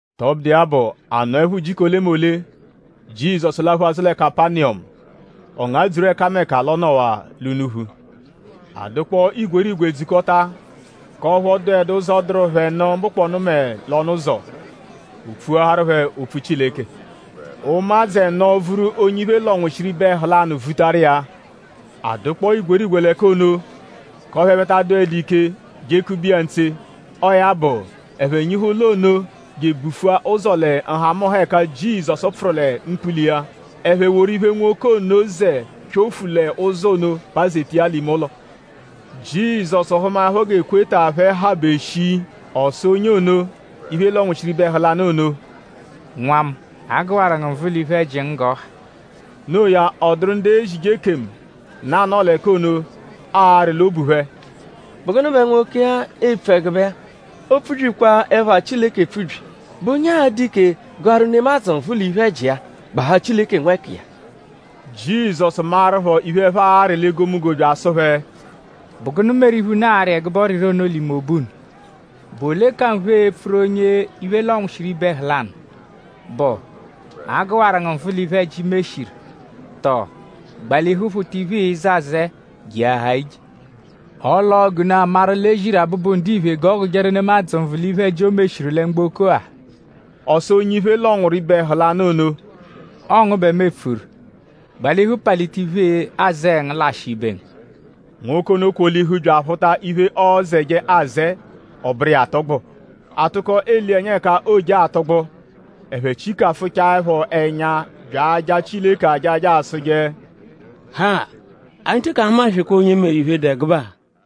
Tọbudu iya bụ; a nọepho ujiku olemole; Jizọsu laphu azụ lẹ Kapaniyọmu. Ọ ngadzuru ẹkameka l'ọ nọwaa l'unuphu. A dụkpoo igwerigwe dzukọta; k'ọphu ọ dụedu ụzo, dụru phẹ nụ mbụkponu mẹ l'ọnu-ụzo. O pfuaharu phẹ opfu Chileke. Ụmadzu ẹno vuru onye iphe lọnwushiru ibe ẹhu lanụ vutaru iya. A dụkpoo igwerigwe l'ẹka ono; k'ọphu ẹphe ta adụdu ike jekube iya ntse. Ọo ya bụ; ẹphe nyihu ụlo ono je ebufua ụzo lẹ nhamụnha ẹka Jizọsu pfụru lẹ mkpula iya. Ẹphe woru iphe, nwoke ono zẹ pyofu l'ụzo ono pazeta iya l'ime ụlo. Jizọsu hụmaepho g'ekweta phẹ habe shii; ọ sụ onye ono, iphe lọnwushiru ibe ẹhu lanụ ono: “Nwa mu; a gụwaru ngu nvụ l'iphe-ẹji ngu g'ọ ha.” Noo ya; ọ dụru ndu ezije ekemu, nọ anọo l'ẹka ono arị l'obu phẹ: “?Bụ gụnu bẹ nwoke-a epfu ẹgube-a? Oopfubyikwa ẹpha Chileke epfubyi!?Bụ onye a-dụ ike gụaru nemadzụ nvụ l'iphe-ẹji iya; gbahaa Chileke nwẹkiya?” Jizọsu maẹrupho iphe, ẹphe arị l'egomunggo bya asụ phẹ: “?Bụ gụnu meru iphe, unu arị ẹgube ọriri ono l'ime obu unu? ?Bụ ole ka nphe epfuru onye iphe lọnwushiru ibe ẹhu lanụ??Bụ: ‘A gụwaru ngu nvụ l'iphe-ẹji, i meshiru?’ Tọo ‘Gbalihu phụta iphe, ịize azẹe jeahaa ije.’ Ọle ọo g'unu a-maru l'e ziru Abụbu-Ndiphe g'ọ gụjeru nemadzụ nvụ l'iphe-ẹji, o meshiru lẹ mgboko-a.” Ọ sụ onye iphe lọnwuru ibe ẹhu lanụ ono: “Ọo ngu bẹ mu epfuru. Gbalihu palita iphe-azẹe ngu lashịa ibe ngu.” Nwoke ono kwolihu bya aphụta iphe, ọozeje azẹe; ọ bụru iya atụgbu. A tụko ele iya ẹnya ẹka ooje atụgbu; ẹphe chikafụchaepho ẹnya bya aja Chileke ajaja asụje: “Ha! Anyi teke ahumaswekwaa onye meru iphe, dụ ẹgube-a!”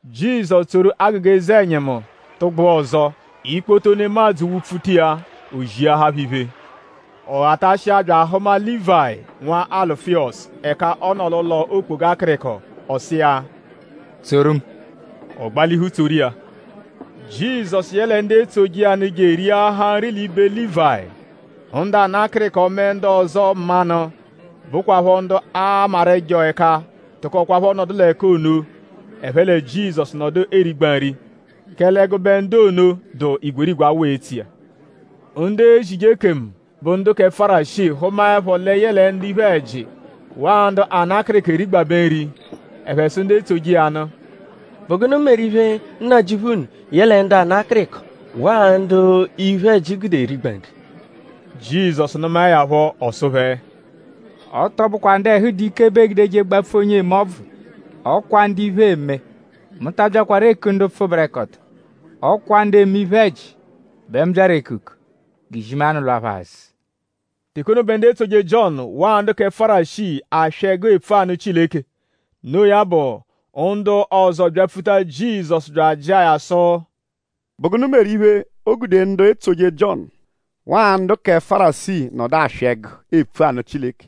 Jizọsu tsoru agụga eze-ẹnyimu tụgbua ọzo. Ikpoto nemadzụ wụ-pfuta iya; o ziahaa phẹ iphe. Ọ ghatashia bya ahụma Lívayi nwa Alufiyọsu ẹka ọ nọ l'ụlo okpoga akịriko. Ọ sụ iya; “Tsoru mu.” Ọ gbalihu tsoru iya. Jizọsu yẹle ndu etsoje iya nụ je eriahaa nri l'ibe Lívayi. Ndu ana akịriko mẹ ndu ọzo mmanụ, bụkwapho ndu aamaru ẹjo ẹka tụkokwapho nọdu l'ẹka ono; ẹphe lẹ Jizọsu nọdu erigba nri; kẹle ẹgube ndu ono dụ igwerigwe awụ etso iya. Ndu ezije ekemu, bụ ndu kẹ Fárisii hụmaepho lẹ yẹle ndu iphe-ẹji; waa ndu ana akịriko erigbabẹ nri; ẹphe sụ ndu etsoje iya nụ: “?Bụ gụnu meru iphe, Nnajịuphu unu yẹle ndu ana akịriko; waa ndu iphe-ẹji gude erigba nri?” Jizọsu nụmae ya phọ; ọ sụ phẹ: “Ọ tọ bụkwa ndu ẹhu dụ ike bẹ eegudeje gbapfu onye eme ọbvu; ọ kwa ndu iphe eme. Mu ta abyakwaru eku ndu pfụberekoto; ọ kwa ndu eme iphe-ẹji bẹ mu byaru ekuku; g'izimanụ lwa phẹ azụ.” Teke ono bẹ ndu etsoje Jiọnu; waa ndu kẹ Fárisii aswị ẹgu epfu anụ Chileke. Noo ya bụ; ndu ọzo byapfuta Jizọsu bya ajịa ya sụ: “?Bụ gụnu meru iphe, o gude ndu etsoje Jiọnu; waa ndu kẹ Fárisii nọdu aswị ẹgu epfu anụ Chileke;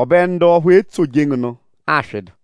ọbe ndu ọphu etsoje ngu nụ aswịdu?”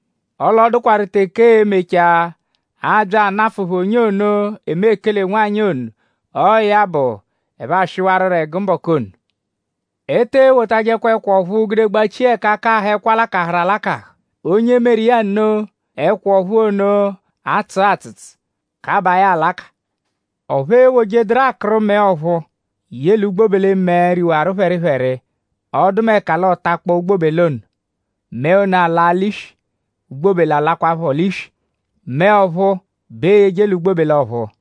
Ọle ọ dụkwaru teke ee-mechaa; aabya anafụ phẹ onye ono, eme ekele-nwanyị ono. Ọo ya bụ; ẹphe aswịwaro ẹgu mbọku ono. “E te ewotajẹkwa ẹkwa ọ̀phúú gude gbachia ẹka akahụ ẹkwa lakahụru alakahụ. Onye meru iya nno; ẹkwa ọ̀phúú ono atsụa atsụtsu; kabaa ya alaka. Ọphu eewojeduru akụru mẹe ọ̀phúú ye l'ugbobele-mẹe, riwaru phẹripheri; ọdumeka l'ọ takpọo ugbobele ono. Mẹe ono alaa l'iswi; ugbobele alakwaphọ l'iswi. Mẹe ọ̀phúú bẹ eeyeje l'ugbobele ọ̀phúú.”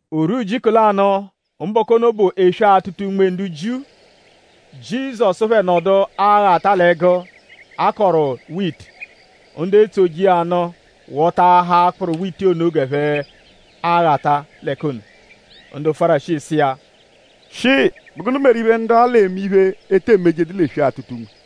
O rwua ujiku lanụ; mbọku ono bụ eswe-atụta-unme ndu Jiu; Jizọsu phẹ nọdu aghata l'ẹgu, a kọru witi; ndu etsoje iya nụ wọtaahaa akpụru witi ono g'ẹphe aghata l'ẹka ono. Ndu Fárisii sụ iya: “Shịi?Bụ gụnu meru iphe ndu-a l'eme iphe, e te emejedu l'eswe-atụta-unme?”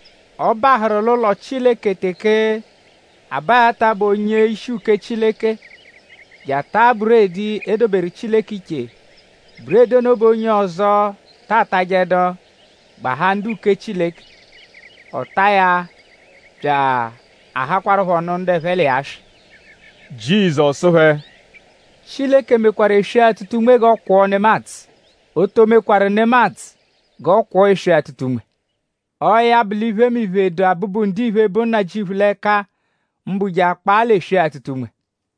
Ọ bahụru l'ụlo Chileke teke Abayata bụ onye-ishi uke Chileke je ataa buredi, e doberu Chileke iche. Buredi ono bẹ onye ọzo ta atajẹdu; gbahaa ndu-uke Chileke. Ọ taa ya bya ahakwarụpho nụ ndu ẹphe l'iya swị.” Jizọsu sụ phẹ: “Chileke mekwarụ eswe-atụta-unme g'ọ kwọo nemadzụ. O to mekwarụ nemadzụ g'ọ kwọo eswe-atụta-unme. Ọo ya bụ l'iphemiphe, dụ Abụbu-Ndiphe, bụ Nnajịuphu l'ẹka; mbụ je akpaa l'eswe-atụta-unme.”